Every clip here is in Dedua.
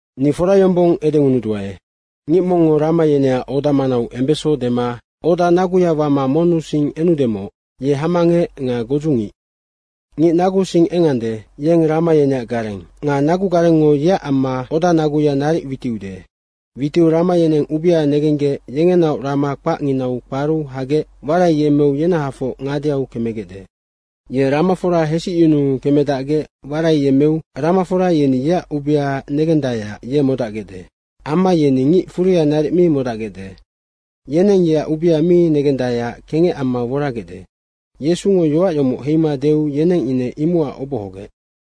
Ni fora yombong edengunuduae, “Ngic mongngo rama yeneac oda manau embeso dema oda naguya wama monnusing enudemoc, ye hamangec nga godzungic. Ngic naguusing engande, yeng rama yeneac gareng. Nga nagugarengngo yeac amma odanaguya naric witiude. Witiu rama yeneng ubea negenggec, yengenaoc rama kpacnginau kparu hagec waraiyemmeu yenahafoc ngadeau kemegecde. Ye ramafora hesicyunuu kemedacgec waraiyemmeu ramafora yeni yeac ubea negendaeac ye modacgecde. Amma yeni ngic furia naric mi modacgecde. Yeneng yeac ubea mi negendaeac kengec amma woragecde.” Yesungo yoac yomoc heima deu yeneng ine imocac obohogec.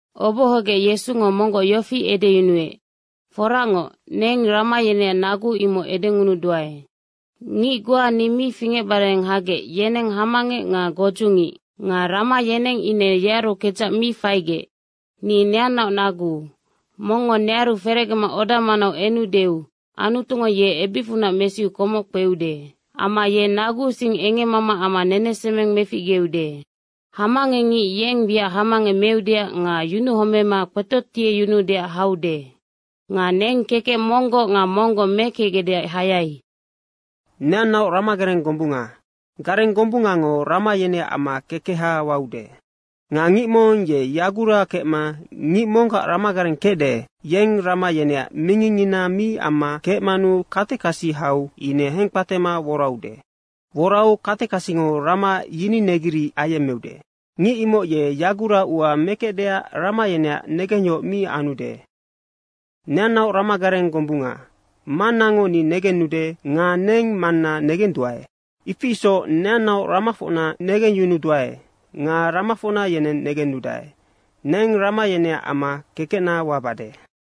Obohogec Yesungo monggoc yofi edeyunuec, “Foracngoc, neng rama yeneac nagu, imoc edengunuduae. Ngic goa ni mi fingecbare hagec, yeneng hamangec nga godzungic. Nga rama yeneng ine yenearu kedzac mi faigec. Ni neannaoc nagu. Mongngo nearu ferecgema oda manau enudeu Anutungo ye ebicfunac mesiu komoc kpeude. Amma ye naguusing engemmama amma nenesemeng meficgeude. Hamangecngic yeng wiac hamangec meudeac nga yunuhomema kpetotieyunuudeac haude. Nga neng kekec monggoc nga monggoc mekecgecdeac hayai. Neannaoc ramagareng gombunga. Gareng gombungango rama yeneac amma kekeha waude. Nga ngic mong ye yagura kemma ngic monggac ramagareng kecde, yeng rama yeneac mingingngina mi amma kecmanu katekasi hau ine hengkpatema woraude. Worau katekasingo rama yininegiric ayemmeude. Ngic imoc ye yaguraua mekecdeac rama yeneac negengyohoc mi anude. Neannaoc ramagareng gombunga. Mannango ni negennude nga neng Manna negenduae, ifi isoc neannaoc ramafocna negengyunuduae nga ramafocna yeneng negennudae. Neng rama yeneac amma kekecna wabade.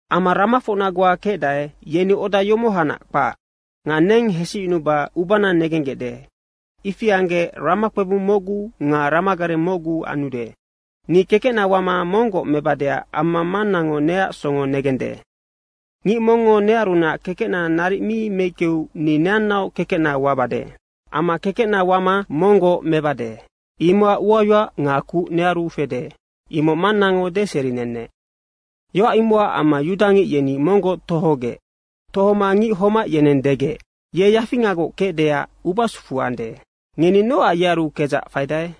Amma ramafocna goa kecdae, yeni oda yomohanac kpac. Nga neng hesicyunuba ubana negenggecde. Ifi anggec ramakpebung mocgu nga ramagareng mocgu anude. Ni kekecna wama monggoc mebadeac amma Manggacngo neac songo negende. Ngic mongngo nearunac kekecna naric mi meickeu ni neannaoc kekecna wabade. Amma kekecna wama monggoc mebade, imocac uayoac nga kuc nearu fede. Imoc Mannango deserinenec.” Yoac imocac amma yudangic yeni monggoc tohogec. Tohoma ngic homac yeneng degec, “Ye yafingagoc kecdeac ubasufu ande. Ngeni nocac yearu kedzac faidae?”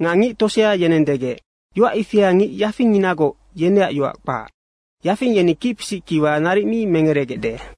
Nga ngic tosea yeneng degec, “Yoac ifia ngic yafingnginagoc, yeneac yoac kpac. Yafing yeni kicpisic kiwa naric mi merecgegecde.”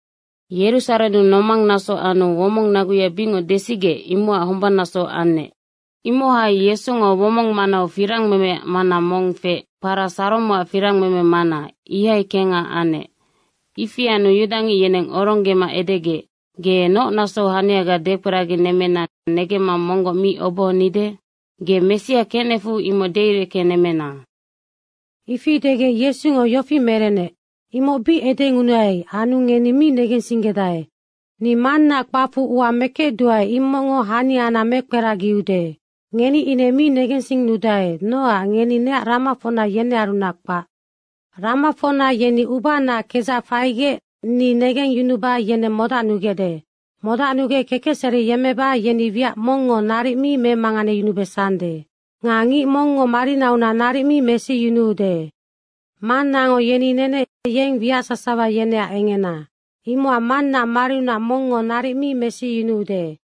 Yerusarennu nomang naso anu womong naguya bicngoc desigec, imocac hombannaso anec. Imohai Yesungo womong manau firangmemeac mana mong feec, kpara Saromoac firangmeme mana, ihai kengha anec. Ifi anu yudangic yeneng oronggema edegec, “Ge noc nasou haniaga dekperaginemmena negemma monggoc mi obohonide? Ge Messia kecnecfu imoc deireckenemmena.” Ifi degec Yesungo yofi merenec, “Imoc bic edengunuai anu ngeni mi negensinggedae. Ni Mannaac kpacfu ua mekecduae, imocngo haniana mekperagiude. Ngeni ine mi negensinnudae, nocac ngeni neac ramafocna, yenearunac kpac. Ramafocna yeni ubanaac kedzac faigec ni negengyunuba yeneng modacnugecde. Modacnugec kekecseri yemmeba yeni wiac mongngo naric mi memanganeyunubesande. Nga ngic mongngo marinaunac naric mi mesiyunuude. Mannango yeni nenec, yeng wiac sasawa yeneac engena. Imocac Mannaac mariunac mongngo naric mi mesiyunuude.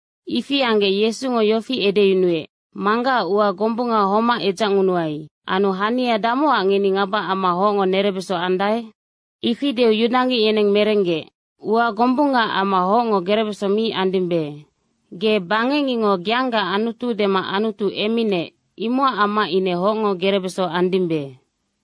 Ifi anggec Yesungo yofi edeyunuec, “Manggacac ua gombung homac edzacngunuai. Anu hania damocac ngeni ngaba amma hocngo nerebesonga andae?” Ifi deu yudangic yeneng merenggec, “Ua gombungaac amma hocngo gerebeso mi andimbe. Ge bangecngicngo geangaac Anutu dema Anutu emminec, imocac amma ine hocngo gerebeso andimbe.”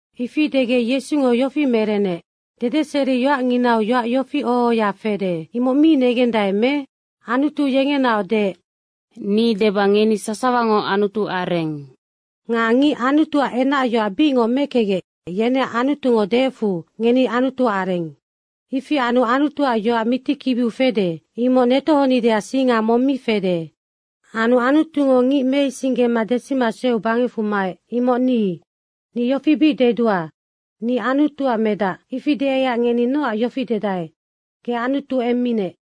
Ifi degec Yesungo yofi merenec, “Dedeseriyoacnginau yoac yofi oho ohoya fede, imoc mi negendae me? Anutu yengenaoc deec, ‘Ni deba, ngeni sasawango anutuareng.’ Nga ngic Anutuac enacyoac bicngoc mekecgec, yeneac Anutungo deecfu, ‘Ngeni anutuareng.’ ifi anu Anutuac yoac mitikibiu fede, imoc netohonideac singa mong mi fede. Anu Anutungo ngic meisinggema desima sueu bangecfu maec, imoc ni. Ni yofi bic dedua, ‘Ni Anutuac medac.’ Ifi deaiac ngeni nocac yofi dedae, ‘Ge Anutu emminec.’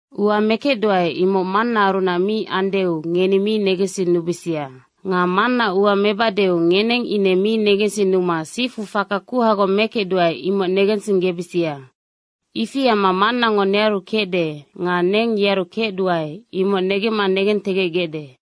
Ua mekecduae, imoc Mannaarunac mi andeu ngeni mi negensinnubisia. Nga Mannaac ua mebadeu ngeneng ine mi negensinnuma sifu faka kuhagoc mekecduae, imoc negensinggebisia. Ifi amma Mannango nearu kecde nga neng yearu kecduae, imoc negemma negentegecgecde.”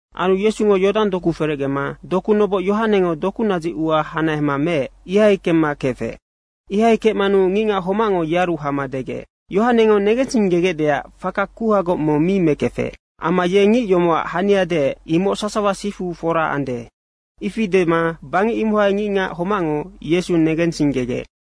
Anu Yesungo Yodang doku ferecgema doku noboc Yohanengo doku nadzic ua hanahema meec, ihai kemma kefec. Ihai kecmanu ngicngac homacngo yearu hama degec, “Yohanengo negensinggegecdeac faka kuhagoc mong mi mekefec. Amma ye ngic yomocac hania deec, imoc sasawa sifu fora ande.” Ifi dema bangec imohai ngicngac homacngo Yesu negensinggegec.